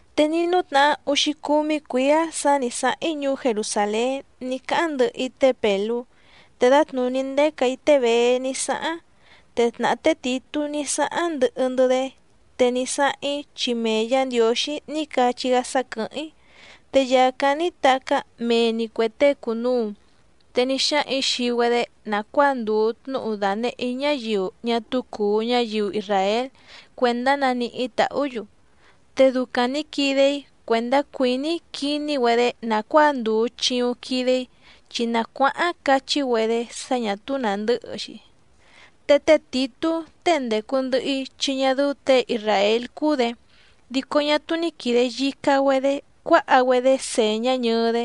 Te ní nútnahá úxícúmí cuǐá sǎ nǐ sáháⁿ‑í ñuú Jerusàlén ní cáháⁿ ndɨhɨ‑í té Pèlú, te dǎtnùní ndécà‑í té Bèé ní sáháⁿ, te tnàhá té Tìtú ní sáháⁿ ndɨhɨ‑ndɨ́‑dé. Te ní sáháⁿ‑í chi mee Yǎ Ndiǒxí ní cachí‑gá sá quɨ̀hɨ́ⁿ‑í. Te yàcáⁿ ní tacá mee‑ni cuè tée cùnuu. Te ní xáhaⁿ‑ǐ xii‑güedé nàcuáa ndùu tnúhu dànehé‑í ñáyiu ñá túú cùu ñáyiu isràél cuèndá naníhí tàhú‑yu. Te ducaⁿ nǐ quide‑í cuèndá cuìní‑í quiní‑güedé nàcuáa ndùu chiuⁿ quide‑í, chi nacuáháⁿ cachí‑güedé sá ñà túú nàndɨ́hɨ‑xi. Te té Tìtú tée ndècu ndɨhɨ‑í chi ñá dɨ́ú těe isràél cúú‑dě, dico ñá túú ní quìde yica‑güedé cuáha‑güedé sèñá ñɨɨ‑dé.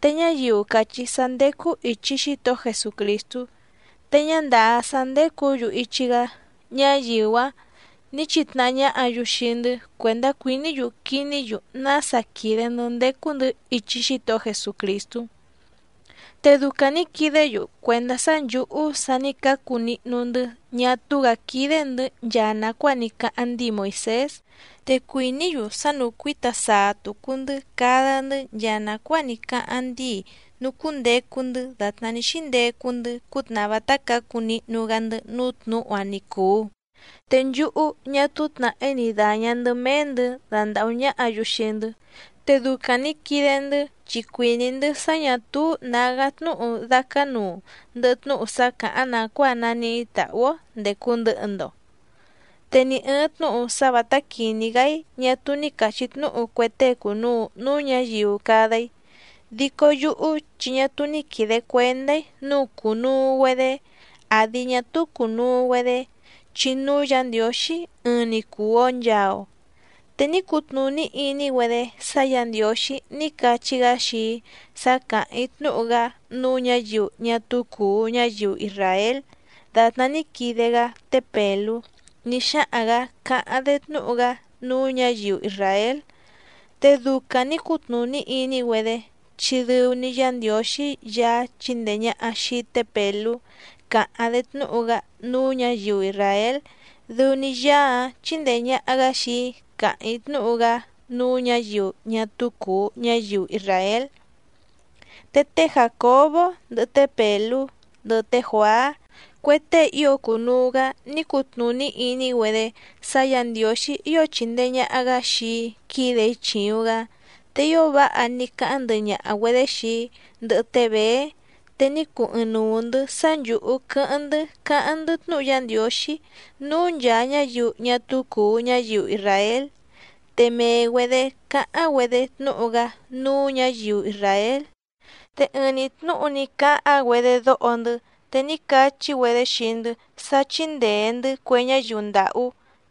Te ñáyiu càchí sá ndécú ìchi Xítohó Jesucrìstú te ñá ndàá sá ndécǔ‑yu ichi‑gá, ñáyiu‑áⁿ nǐ chitnahá ñáhǎ‑yu xii‑ndɨ́ cuèndá cuìní‑yu quiní‑yu nása quìde‑ndɨ́ ndécú‑ndɨ̌ ichi Xítohó Jesucrìstú. Te ducaⁿ nǐ quidé‑yu cuèndá sá nchǔhú sa ní cácu nihnu‑ndɨ́ ñá túú‑gǎ quídé‑ndɨ̌ nchaa nàcuáa ní cáháⁿ ndíi Moìsés. Te cuìní‑yu sá núcuǐta saa tùcu‑ndɨ́ cada‑ndɨ́ nchaa nàcuáa ní cáháⁿ ndíi nucúndecu‑ndɨ́ dàtná ní xíndecu‑ndɨ́ cútnàhá vátá cǎcu nihnu‑gá‑ndɨ́ núú tnǔhu‑áⁿ ni cùu. Te nchúhú ñá túú tnàhí ni dàña‑ndɨ́ méé‑ndɨ̌ dandàhú ñáhǎ‑yu xii‑ndɨ́. Te ducaⁿ nǐ quide‑ndɨ́, chi cuìní‑ndɨ́ sá ñà túú nǎgá tnúhu dácánuu ndɨhɨ tnúhu sá càháⁿ nàcuáa naníhí tàhú‑ó ndècu ndɨhɨ‑ndo. Te ni ɨ̀ɨⁿ tnúhu sá vǎtá quìní‑gá‑í ñá túú ní càchí tnúhu cue tée cùnuu núú ñǎyiu cada‑í. Dico yúhú chi ñá túú ní quìde cuendá‑í nǔu cùnuu‑güedé àdi ñá túú cùnuu‑güedé, chi núú Yǎ Ndiǒxí ɨɨⁿ‑ni cùu‑o nchaa‑o. Te ní cutnùní iní‑güedé sá Yǎ Ndiǒxí ní cachí‑gá xii‑í sá càháⁿ‑í tnúhu‑gá núú ñǎyiu ñá túú cùu ñáyiu isràél dàtná ní quide‑gá té Pèlú ní xáhaⁿ‑gǎ càháⁿ‑dé tnúhu‑gá núú ñǎyiu isràél. Te ducaⁿ nǐ cutnùní iní‑güedé, chi dɨu‑ni Yá Ndiǒxí Yaá chíndèe ñaha xii té Pèlú càháⁿ‑dé tnúhu‑gá núú ñǎyiu isràél, dɨu‑ni Yaá‑áⁿ chíndèe ñaha‑gá xii‑í càháⁿ‑í tnúhu‑gá núú ñǎyiu ñá túú cùu ñáyiu isràél. Te té Jàcobó, ndɨhɨ té Pèlú, ndɨhɨ té Juàá, cue tée ío cùnuu‑gá ní cutnùní iní‑güedé sá Yǎ Ndiǒxí ío chìndee ñaha‑gá xii‑í quídè‑í chìuⁿ‑gá. Te ío váha ní cáháⁿ ndɨhɨ ñaha‑güedě xii‑í, ndɨhɨ té Bèé, te ní cuu ɨɨⁿnuu‑ndɨ̌ sá nchǔhú quɨ́hɨ́ⁿ‑ndɨ́ cáháⁿ‑ndɨ́ tnúhu Yá Ndiǒxí núú nchàa ñáyiu ñá túú cùu ñáyiu isràél, te mee‑güedě cáháⁿ‑güedé tnúhu‑gá núú ñǎyiu isràél. Te ɨɨⁿ‑ni tnúhu ní cáháⁿ‑güedé dóho‑ndɨ́ te ní cachí‑güedé xii‑ndɨ́ sá chíndèe‑ndɨ́ cue ñáyiu ndàhú,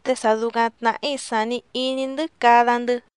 te sa ducaⁿ tnàhí sàni iní‑ndɨ́ cada‑ndɨ́.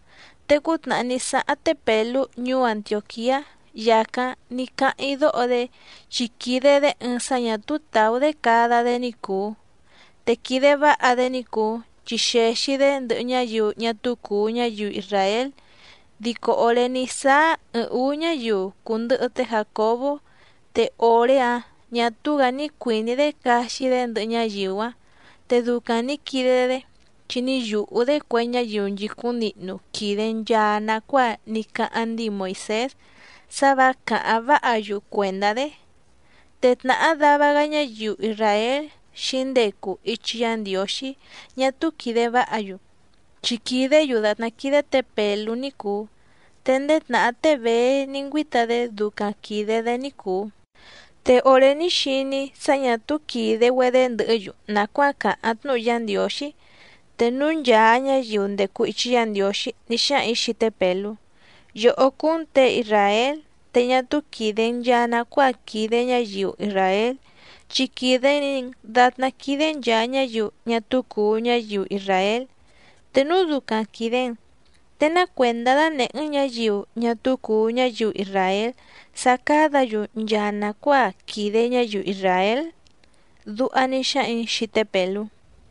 Te cútnàhá ní sáháⁿ té Pèlú ñuú Antiòquiá yàcáⁿ ní cáháⁿ‑í dóho‑dé, chi quìde‑dé ɨɨⁿ sá ñà túú tàú‑dé cada‑dé ní cùu. Te quìde váha‑dé ní cùu chi xèxi‑dé ndɨhɨ ñáyiu ñá túú cùu ñáyiu isràél, dico òré ní sáá ɨɨⁿ ǔú ñáyiu cùndɨhɨ té Jàcobó, te òré‑áⁿ ñà túú‑gǎ ní cuìní‑dé caxi‑dé ndɨhɨ ñáyiu‑áⁿ. Te ducaⁿ nǐ quide‑dé chi ní yùhú‑dé cue ñáyiu nchìcúⁿ nihnu quìde nchaa nacuáa ní cáháⁿ ndíi Moìsés sá vǎ càháⁿ váha‑yu cuèndá‑dé. Te tnàhá dava‑gá ñáyiu isràél xǐndecu ichi Yá Ndiǒxí ñá túú quìde váha‑yu, chi quìdé‑yu dàtná quídé tě Pèlú ní cùu, te ndéé tnàhá té Bèé ní ngüíta‑dé ducaⁿ quìde‑dé ní cùu. Te òré ní xiní‑í sá ñà túú quìde‑güedé ndɨhɨ́‑yu nàcuáa càháⁿ tnúhu Yá Ndiǒxí, te núú nchàa ñáyiu ndècu ichi Yá Ndiǒxí ní xáhaⁿ‑ǐ xii té Pèlú: “Yòhó cúú‑n těe isràél, te ñá túú quìde‑n nchaa nacuáa quìde ñáyiu isràél, chi quìde‑ni‑n datná quídé nchàa ñáyiu ñá túú cùu ñáyiu isràél. Te núu ducaⁿ quìde‑n, ¿te ná cuèndá dánèhé‑n ñǎyiu ñá túú cùu ñáyiu isràél sá cádǎ‑yu nchaa nàcuáa quìde ñáyiu isràél?”, duha ní xáhaⁿ‑ǐ xii té Pèlú.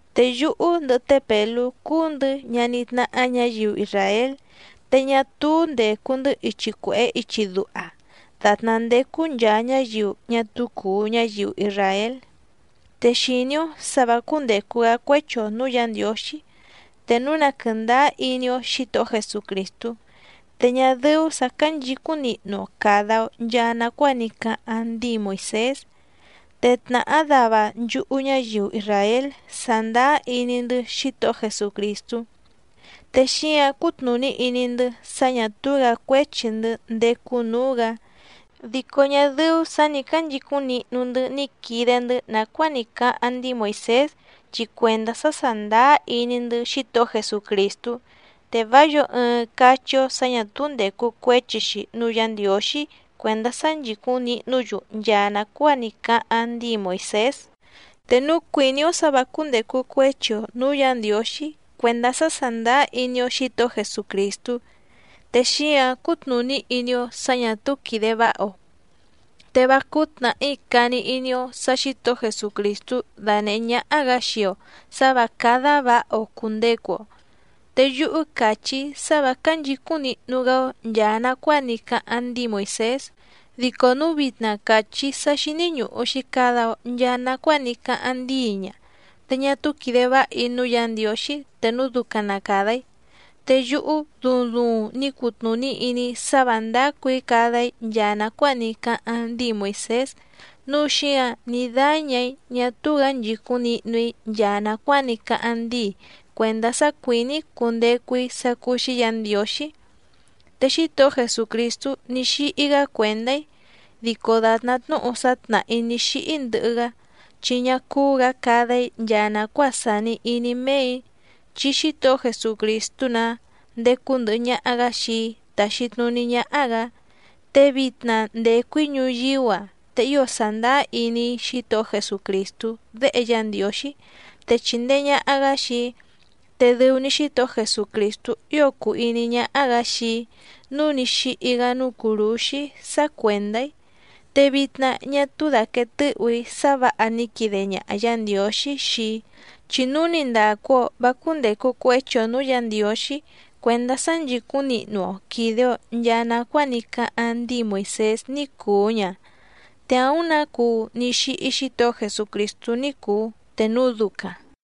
Te yúhú ndɨhɨ té Pèlú cúú‑ndɨ̌ ñaní tnáhá ñǎyiu isràél, te ñá túú ndècu‑ndɨ́ ichi cuèhé ichi duha dàtná ndécú nchàa ñáyiu ñá túú cùu ñáyiu isràél. Te xìní‑ó sǎ vǎ cúndècu‑gá cuéchi‑o nǔú Yǎ Ndiǒxí te núu na quɨ̀ndáá iní‑ó Xǐtohó Jesucrìstú, te ñá dɨ́ú sǎ cánchǐcúⁿ nihnu‑o càda‑o nchaa nacuáa ní cáháⁿ ndíi Moìsés. Te tnàhá dava nchúhú ñáyiu isràél sàndáá iní‑ndɨ́ Xítohó Jesucrìstú, te xíǎⁿ cútnùní iní‑ndɨ́ sá ñà túú‑gǎ cuéchi‑ndɨ́ ndécú nǔú‑gǎ, dico ñá dɨ́ú sǎ nǐ cánchicúⁿ nihnu‑ndɨ́ ní quide‑ndɨ́ nàcuáa ní cáháⁿ ndíi Moìsés, chi cuèndá sá sàndáá iní‑ndɨ́ Xítohó Jesucrìstú. Te vá yǒo ɨɨⁿ cachí‑ó sǎ ñà túú ndècu cuéchi‑xi núú Yǎ Ndiǒxí cuèndá sá nchìcúⁿ nihnú‑yu nchaa nàcuáa ní cáháⁿ ndíi Moìsés. Te núu cuìní‑ó sǎ vǎ cúndècu cuéchi‑o nǔú Yǎ Ndiǒxí cuèndá sá sàndáá iní‑ó Xǐtohó Jesucrìstú, te xíǎⁿ cútnùní iní‑ó sǎ ñà túú quìde váha‑o. ¡Te vá cúú tnàhí cani iní‑ó sǎ Xǐtohó Jesucrìstú dánèhé ñáhá‑gǎ xii‑o sǎ vǎ cádá vǎha‑o cùndecu‑o! Te yúhú càchí‑í sá vǎ cánchǐcúⁿ nihnu‑gá‑ó nchàa nacuáa ní cáháⁿ ndíi Moìsés, dico núu vitna càchí‑í sá xíní ñùhu‑xi cada‑o nchaa nacuáa ní cáháⁿ ndíi ña, te ñá túú quìde váha‑í núú Yǎ Ndiǒxí te núu ducaⁿ na càda‑í. Te yúhú duuⁿ duuⁿ ní cutnùní iní‑í sá vǎ ndácù‑í cada‑í nchaa nàcuáa ní cáháⁿ ndíi Moìsés nǔu xíǎⁿ ní dáñà‑í ñá túú‑gǎ nchìcúⁿ nihnu‑í nchaa nàcuáa ní cáháⁿ ndíi cuèndá sá cuìní‑í cundecu‑í sá cúú‑xí Yǎ Ndiǒxí. Te Xítohó Jesucrìstú ní xíhí‑gá cuèndá‑í, dico dàtná tnúhu sá tnàhá‑í ní xíhí ndɨhɨ‑gá, chi ñá cúú‑gǎ cada‑í nchaa nàcuáa sàni iní méè‑í, chi Xítohó Jesucrìstú‑nǎ ndécú ndɨ̀hɨ ñaha‑gá xii‑í táxí tnùní ñáhá‑gǎ. Te vitna ndècu‑í ñuyíú‑a, te ío sàndáá iní‑í Xítohó Jesucrìstú Déhe Yá Ndiǒxí, te chìndee ñaha‑gá xii‑í. Te dɨu‑ni Xítohó Jesucrìstú ío cùu iní ñáhá‑gǎ xii‑í nǔu ní xíhí‑gá núú cùrúxí sá cuèndá‑í. Te vitna ñá túú dàquee tɨ́hù‑í sá vǎha ní quide ñaha Yǎ Ndiǒxí xii‑í, chi núu ni ndàcu‑o vá cúndècu cuéchi‑o nǔú Yǎ Ndiǒxí cuèndá sá nchìcúⁿ nihnu‑o quìde‑o nchaa nacuáa ní cáháⁿ ndíi Moìsés ní cùu ña, te àúⁿ nǎ cuu ní xíhí Xítohó Jesucrìstú ní cùu te núu ducaⁿ.